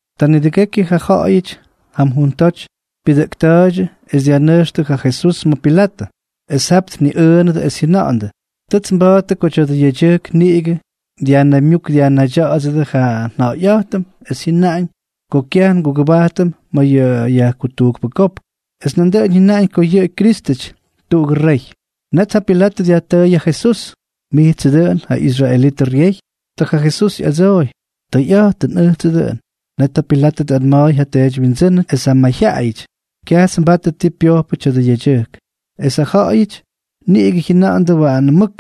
Ta nidʉgekyʉ ja ja̱ꞌa̱yʉty jam juntoty pyʉdʉꞌkta̱a̱ydyʉ, es dyajnʉjxtʉ ja Jesús ma̱ Pilatʉ. Es jap tniꞌʉꞌʉnʉdʉ es jyʉnandʉ: —Tʉts nba̱a̱ttʉ ko tya̱dʉ yedyʉjk niꞌigʉ dyajnaymyúk dyajnaydya̱ꞌa̱dsʉdʉ ja nja̱ꞌa̱yꞌa̱jtʉm es jyʉnaꞌañ ko kyaj ngugʉbajtʉm ma̱ yʉ yajkutujkpʉ kopk, es nandʉꞌʉn jyʉnaꞌañ ko yʉꞌʉ Kyrístʉty, tuꞌugʉ rey. Net ja Pilatʉ dyajtʉʉy ja Jesús: —¿Mijtsʉ dʉꞌʉn ja israelítʉdyʉ ryey? Ta ja Jesús ꞌyadsooy: —Tʉyꞌa̱jtʉn, ʉjtsʉ dʉꞌʉn. Net ja Pilatʉ tꞌanma̱a̱y ja teedywyindsʉ́nʉty es ja mayjyaꞌayʉty: —Kyajts nbatʉ ti pyojpʉ tya̱dʉ yedyʉjk. Es ja ja̱ꞌa̱yʉty niꞌigʉ jyʉnandʉ waanʉ mʉk: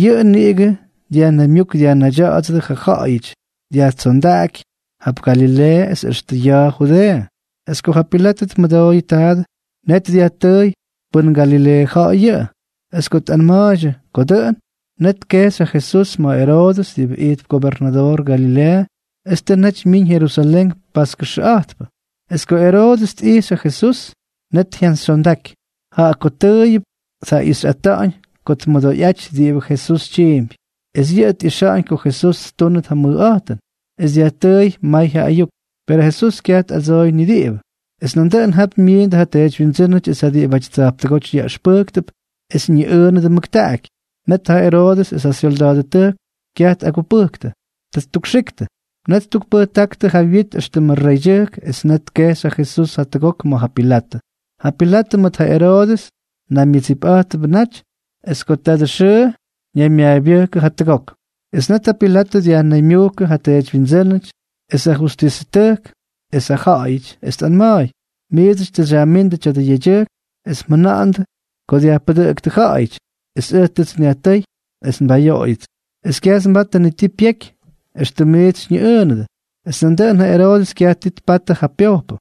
—Yʉꞌʉ niꞌigʉ dyajnaymyúk dyajnaydya̱ꞌa̱dsʉdʉ ja ja̱ꞌa̱yʉty, dyajtsondáky jap Galileeʉ, es extʉ ya̱a̱ Judeeʉ. Es ko ja Pilatʉ tmʉdooyʉ taadʉ, net dyajtʉʉy pʉn Galileeʉ ja̱ꞌa̱y yʉꞌʉ. Es ko tꞌanma̱a̱ydyʉ ko dʉꞌʉn, net tkejxy ja Jesús ma̱ Eroodʉs diꞌibʉ ijtp gobernadoor Galileeʉ es tʉ naty myiñ Jerusalén paskʉxʉꞌa̱jtpʉ. Es ko Eroodʉs tꞌijxy ja Jesús, net jyantsyxyondaky, jaꞌa ko tʉʉyʉp tjaꞌixyꞌatáñ ko tmʉdoyꞌajty diꞌibʉ Jesús tyiimpy. Es yʉꞌʉ tꞌixa̱ꞌa̱ñ ko Jesús ttúnʉt ja mʉjꞌa̱jtʉn. Es dyajtʉʉy may ja ayuk. Perʉ Jesús kyaj tꞌadsooy ni diꞌibʉ. Es nandʉꞌʉn jap myiindʉ ja teedywyindsʉ́nʉty es ja diꞌibʉty tsa̱jptʉgóty yaꞌʉxpʉjktʉp, es ñiꞌʉʉnʉdʉ mʉktaꞌaky. Net ja Eroodʉs es ja syolda̱a̱dʉtʉjk kyaj tꞌagupʉjktʉ. Ta ttukxiktʉ. Net ttukpʉjtáktʉ ja wyit éxtʉmʉ reydyʉjk es net tkejxy ja Jesús jatʉgok ma̱ ja Pilatʉ. Ja Pilatʉ mʉt ja Eroodʉs naymyʉdsipꞌa̱jtʉdʉbʉ naty es ko tadʉ xʉʉ ñaymyaabyʉjkʉdʉ jatʉgok. Es net ja Pilatʉ dyajnaymyujkʉ ja teedywyindsʉ́nʉty es ja justisʉtʉjk es ja ja̱ꞌa̱yʉty, es tꞌanma̱a̱y: —Miidsʉty tʉ xyajmíndʉ tya̱dʉ yedyʉjk es mjʉna̱ꞌa̱ndʉ ko dyajpʉdʉꞌʉktʉ ja̱ꞌa̱yʉty, es ʉj tʉts nyajtʉ́y es nbayoꞌoyʉts, es kyajts nbatʉ ni ti pyeky éxtʉm miits xyñiꞌʉʉnʉdʉ. Es nandʉꞌʉn ja Eroodʉs kyaj ti tpatʉ ja pyojpʉ.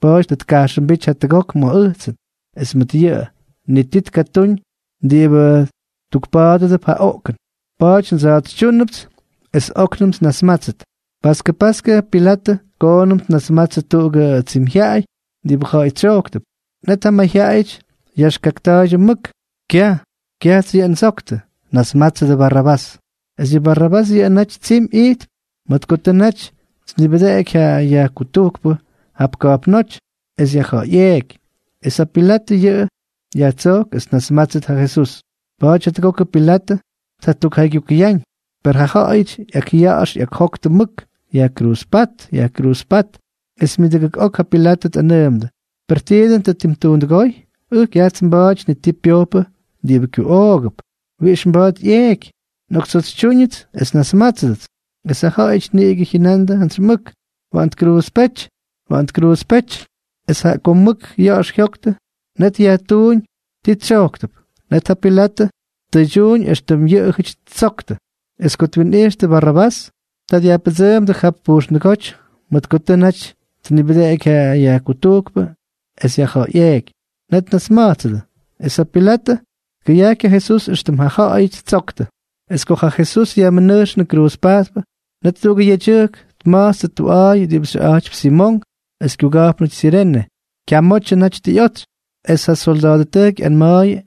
Pa̱a̱ty tʉ tkajxʉmbíty jatʉgok ma̱ ʉjtsʉn. Es mʉt yʉꞌʉ, ni ti tkatúñ diꞌibʉ tukpa̱a̱dʉdʉp ja oꞌkʉn. Pa̱a̱ty ndsa̱a̱tsytyúnʉpts es óknʉmts nnasmátsʉt. Paskʉ paskʉ ja Pilatʉ koonʉm tnasmatsʉ tuꞌugʉ tsimyjyaꞌay diꞌibʉ ja̱ꞌa̱y tsyojktʉp. Net ja mayjyaꞌayʉty yaxkakta̱a̱ydyʉ mʉk: —¡Kyaj! ¡Kyajts yʉꞌʉ ndsoktʉ! ¡Nasmatsʉ Barrabás! Es yʉ Barrabás yʉꞌʉ naty tsimy ijtp mʉt ko tʉ naty tnibʉdeꞌeky ja yajkutujkpʉ jap ka̱jpnóty es yajja̱ꞌa̱yꞌeeky. Es ja Pilatʉ jaꞌa jyatsojk es tjanasmátsʉt ja Jesús, pa̱a̱ty jatʉgokʉ Pilatʉ tjatukjaygyukʉyáñ. Per ja ja̱ꞌa̱yʉty ꞌyakꞌya̱ꞌa̱x ꞌyakjoktʉ mʉk: —¡Yajkruuzpát, yajkruuzpát! Es myʉdʉgʉk ok ja Pilatʉ tꞌanʉʉmʉdʉ: —¿Per ti dʉn tʉ ttuundʉgóy? Ʉj kyajts nba̱a̱ty ni ti pyojpʉ diꞌibʉ kyuꞌoogʉp, wiꞌix mba̱a̱t ꞌyeeky. Nꞌoktsa̱a̱tsytyúñʉts es nnasmátsʉdʉts. Es ja ja̱ꞌa̱yʉty niꞌigʉ jyʉnandʉ jantsy mʉk: —¡Waꞌan tkruuzpéty! ¡Waꞌan tkruuzpéty! Es jaꞌa ko mʉk yax jyojktʉ, net yajtuuñ ti tsyojktʉp. Net ja Pilatʉ tkuydyuuñ éxtʉm yʉꞌʉjʉty ttsojktʉ. Es ko twinꞌijxtʉ Barrabás, ta dyajpʉdsʉʉmdʉ jap pujxndʉgóty mʉt ko tʉ naty tnibʉdeꞌeky ja yajkutujkpʉ es yajja̱ꞌa̱yꞌeeky. Net tnasma̱jtsʉdʉ. Es ja Pilatʉ tkʉyajky ja Jesús éxtʉm ja ja̱ꞌa̱yʉty ttsojktʉ. Es ko ja Jesús yajmʉnʉjxnʉ kruuzpajtpʉ, net tuꞌugʉ yedyʉjk tma̱jtstʉ tuꞌa̱a̱y diꞌibʉ xyʉꞌa̱jtypy Simonk es kyuga̱jpnʉty Sirene. Kyamotyʉ naty tʉ ꞌyotsy. Es ja solda̱a̱dʉtʉjk ꞌyanma̱a̱yʉ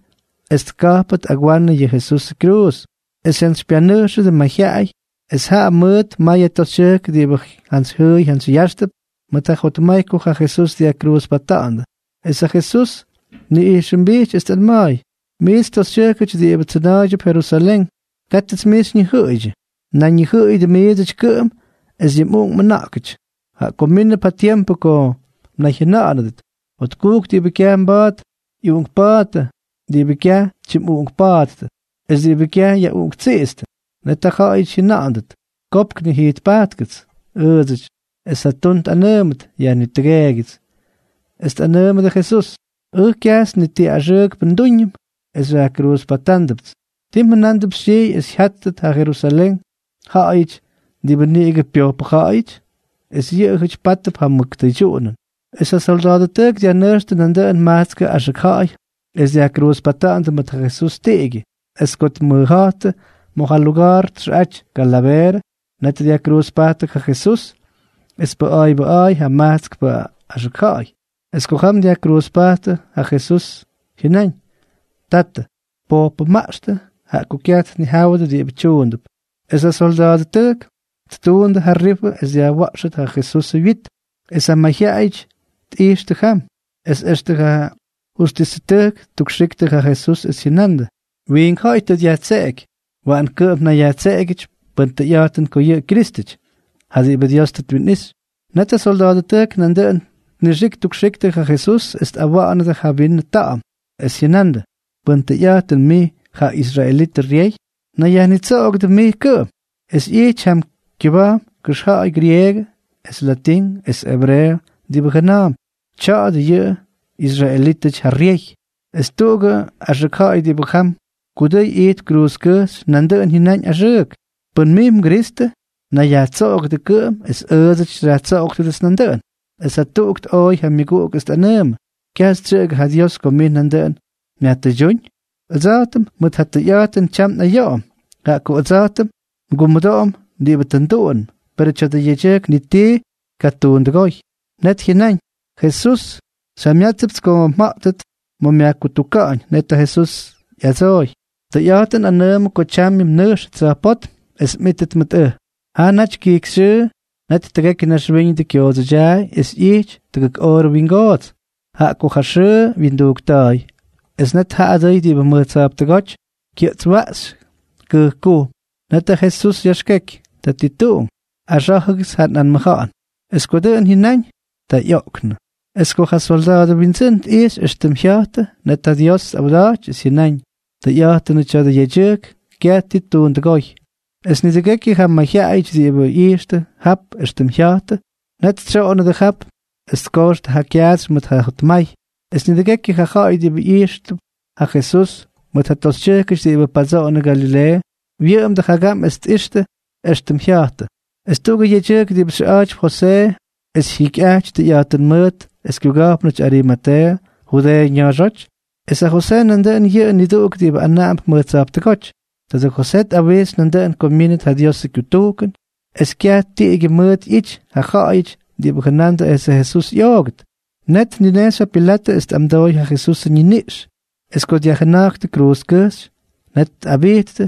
es tka̱jpʉt agwanʉ yʉ Jesusʉ kyruuz. Es jyantsypyanʉjxʉdʉ mayjyaꞌay, es jaꞌa mʉʉt mayʉ toxytyʉjk diꞌibʉ jantsyjyʉʉy jantsyyáxtʉp mʉt ja jotmay ko ja Jesús dyajkruuzpata̱ꞌa̱ndʉ. Es ja Jesús tniꞌijxʉmbijty es tꞌanma̱a̱y: —Miits toxytyʉjkʉty diꞌibʉ tsʉna̱a̱ydyʉp Jerusalén, kátʉts mij xyñijʉꞌʉydyʉ. Nayñijʉꞌʉyʉdʉ miidsʉty kʉꞌʉm es yʉ mꞌuꞌunk mꞌʉna̱ꞌkʉty, jaꞌa ko mínʉp ja tiempʉ ko mnayjyʉna̱ꞌa̱nʉdʉt: “Jotkujk diꞌibʉ kyaj mba̱a̱t ꞌyuꞌunkpa̱a̱ttʉ, diꞌibʉ kyaj tyimꞌuꞌunkpáttʉ es diꞌibʉ kyaj yaꞌuꞌunktsiꞌitstʉ.” Net ja ja̱ꞌa̱yʉty jyʉna̱ꞌa̱ndʉt: “Kopk, nijijtpajtkʉts ʉʉdsʉty”, es ja tun tꞌanʉʉmʉt: “Yajnitʉgeegyʉts.” Es tꞌakꞌanʉʉmʉdʉ Jesús: —Ʉj kyajts ni ti axʉʉkpʉ ndúñʉm es xyajkruuzpatándʉpts. ¿Ti mjʉna̱a̱mp xytyijy es jyáttʉt ja Jerusalén ja̱ꞌa̱yʉty diꞌibʉ niꞌigʉ pyojpʉ ja̱ꞌa̱yʉty?, es yʉꞌʉjʉty pátʉp ja mʉk tʉydyuꞌunʉn. Es ja solda̱a̱dʉtʉjk dyajnʉjxtʉ nandʉꞌʉn majtskʉ axʉk ja̱ꞌa̱y es dyajkruuzpata̱ꞌa̱ndʉ mʉt ja Jesús tiꞌigyʉ. Es ko tmʉja̱jttʉ ma̱ ja luga̱a̱r txʉꞌaty Kalaveerʉ, net dyajkruuzpajttʉ ja Jesús. Es pʉꞌa̱a̱ybʉꞌa̱a̱y ja majtskpʉ axʉk ja̱ꞌa̱y. Es ko jam dyajkruuzpajttʉ, ja Jesús jyʉnáñ: —Tatʉ, pojpʉmaꞌxtʉ, jaꞌa ko kyaj tnijáwʉdʉ diꞌibʉ tyuundʉp. Es ja solda̱a̱dʉtʉjk ttuundʉ ja rifʉ es dyajwa̱ꞌxʉt ja Jesusʉ wyit. Es ja mayjyaꞌayʉty tꞌijxtʉ jam, es extʉ ja justisʉtʉjk ttukxiktʉ ja Jesús es jyʉnandʉ: —Wiink ja̱ꞌa̱y tʉ dyajtseꞌeky. Waꞌan kʉꞌʉm tnayyajtseꞌegyʉty pʉn tʉyꞌa̱jtʉn ko yʉꞌʉ Kyrístʉty, ja diꞌibʉ Dios tʉ twinꞌixy. Net ja solda̱a̱dʉtʉjk nandʉꞌʉn tnixik ttukxiktʉ ja Jesús es tꞌawa̱ꞌa̱nʉdʉ ja vinʉ ta̱ꞌa̱m, es jyʉnandʉ: —Pʉn tʉyꞌa̱jtʉn mij ja israelitʉ ryey, nayyajnitsoꞌogʉdʉ mij kʉꞌʉm. Es ꞌyity jam kyʉba̱jm kʉxja̱ꞌa̱y grieegʉ es latín es ebreeʉ diꞌibʉ jʉna̱a̱mp: “Tya̱a̱dʉ yʉ israelítʉty ja ryey.” Es tuꞌugʉ axʉk ja̱ꞌa̱y diꞌibʉ jam kudʉy ijtp kruuzkʉjxy nandʉꞌʉn jyʉnáñ axʉʉk: —Pʉn mij mGristʉ, nayyajnitsoꞌogʉdʉ kʉꞌʉm es ʉʉdsʉty xyajtsoꞌoktʉdʉts nandʉꞌʉn. Es jatuꞌuk tꞌooy ja myʉguꞌuk es tꞌanʉʉmʉ: —¿Kyaj xytsyʉꞌʉgʉ ja Dios ko mij nandʉꞌʉn myajtʉydyúñ? Ʉdsa̱jtʉm mʉt ja tʉyꞌa̱jtʉn tyam nꞌayoꞌom, jaꞌa ko ʉdsa̱jtʉm ngumʉdoꞌom diꞌibʉ tʉ nduꞌunʉm. Perʉ tya̱dʉ yedyʉjk ni tii tʉ tkatuundʉgóy. Net jyʉnáñ: —Jesús, xyjamyátsʉpts ko mja̱ꞌtʉt ma̱ myajkutuka̱ꞌa̱ñ. Net ja Jesús ꞌyadsooy: —Tʉyꞌa̱jtʉn nꞌanʉʉmʉ ko tyamyʉ nmʉnʉjxʉt tsa̱jpótm es mꞌítʉt mʉt ʉj. Jaa naty kijkyxyʉʉ, net tʉgekyʉ naxwíñʉdʉ kyoodsʉdyaay es ꞌyijty tʉgʉk oorʉ wingoots, jaꞌa ko ja xʉʉ wyindujkta̱a̱y. Es net ja adʉy diꞌibʉ mʉj tsa̱jptʉgóty kyʉꞌtswaꞌxy kʉjkkujm. Net ja Jesús yaxkeky: —Tatituꞌunk, axá̱jʉgʉts ja nꞌanmʉja̱ꞌa̱n. Es ko dʉꞌʉn jyʉnáñ, ta ꞌyoꞌknʉ. Es ko ja solda̱a̱dʉ windsʉ́n tꞌijxy éxtʉm jya̱jtʉ, net ja Dios tꞌawda̱jty es jyʉnáñ: —Tʉyꞌa̱jtʉnʉ tya̱dʉ yedyʉjk kyaj ti ttuundʉgóy. Es nidʉgekyʉ ja mayjyaꞌayʉty diꞌibʉ ꞌyijxtʉ jap éxtʉm jya̱jtʉ, net tsyoꞌonnʉdʉ jap es tkojxtʉ ja kyaatsy mʉt ja jotmay. Es nidʉgekyʉ ja ja̱ꞌa̱y diꞌibʉ ꞌyixyꞌa̱jttʉp ja Jesús, mʉt ja toxytyʉjkʉty diꞌibʉ padsoꞌonʉ Galileeʉ, wyʉꞌʉmdʉ jagam es tꞌijxtʉ éxtʉm jya̱jtʉ. Es tuꞌugʉ yedyʉjk diꞌibʉ xyʉꞌa̱jtypy Josee es jyikyꞌaty tʉyꞌa̱jtʉn mʉʉt es kyuga̱jpnʉty Arimateeʉ, Judeeʉ ña̱a̱xóty. Es ja Josee nandʉꞌʉn yʉꞌʉ niduꞌuk diꞌibʉ anaꞌamp mʉj tsa̱jptʉgóty. Tadʉ Josee tꞌawixy nandʉꞌʉn ko myínʉt ja Diosʉ kyutujkʉn es kyaj tiꞌigyʉ mʉt ꞌyity ja ja̱ꞌa̱yʉty diꞌibʉ jʉnandʉ esʉ Jesús ꞌyoogʉt. Net tninejxy ja Pilatʉ es tꞌamdooy ja Jesusʉ ñiniꞌx. Es ko dyajjʉna̱jktʉ kyruuzkʉjxy, net tꞌabijttʉ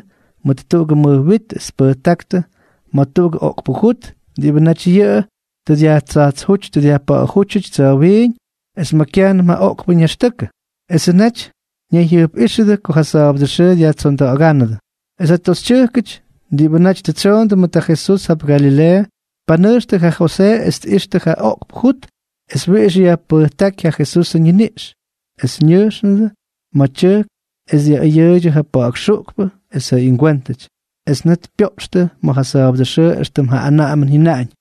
mʉt tuꞌugʉ mʉj wit es tpʉjtáktʉ ma̱ tuꞌugʉ oꞌkpʉ jut diꞌibʉ naty yʉꞌʉ tʉ dyajtsajtsjúty dyajpa̱ꞌa̱jútyʉty tsa̱wiiñ es ma̱ kyajnʉm ja oꞌkpʉ ñaxtʉkʉ. Esʉ naty ñayjyʉjpꞌíxʉdʉ ko ja sa̱a̱bʉdʉ xʉʉ dyajtsonda̱ꞌa̱ga̱ꞌa̱ndʉ. Es ja toxytyʉjkʉty diꞌibʉ naty tʉ tsyoondʉ mʉt ja Jesús jap Galileeʉ, tpanʉjxtʉ ja Josee es tꞌijxtʉ ja oꞌkpʉ jut es wiꞌix yajpʉjtáky ja Jesusʉ ñiniꞌx. Es ñʉjxnʉdʉ ma̱ tyʉjk es dyaꞌʉyʉʉydyʉ ja pa̱ꞌa̱k xuꞌkpʉ es ja ingwéntʉty. Es net pyoꞌxtʉ ma̱ ja sa̱a̱bʉdʉ xʉʉ éxtʉm ja anaꞌamʉn jyʉnaꞌañ.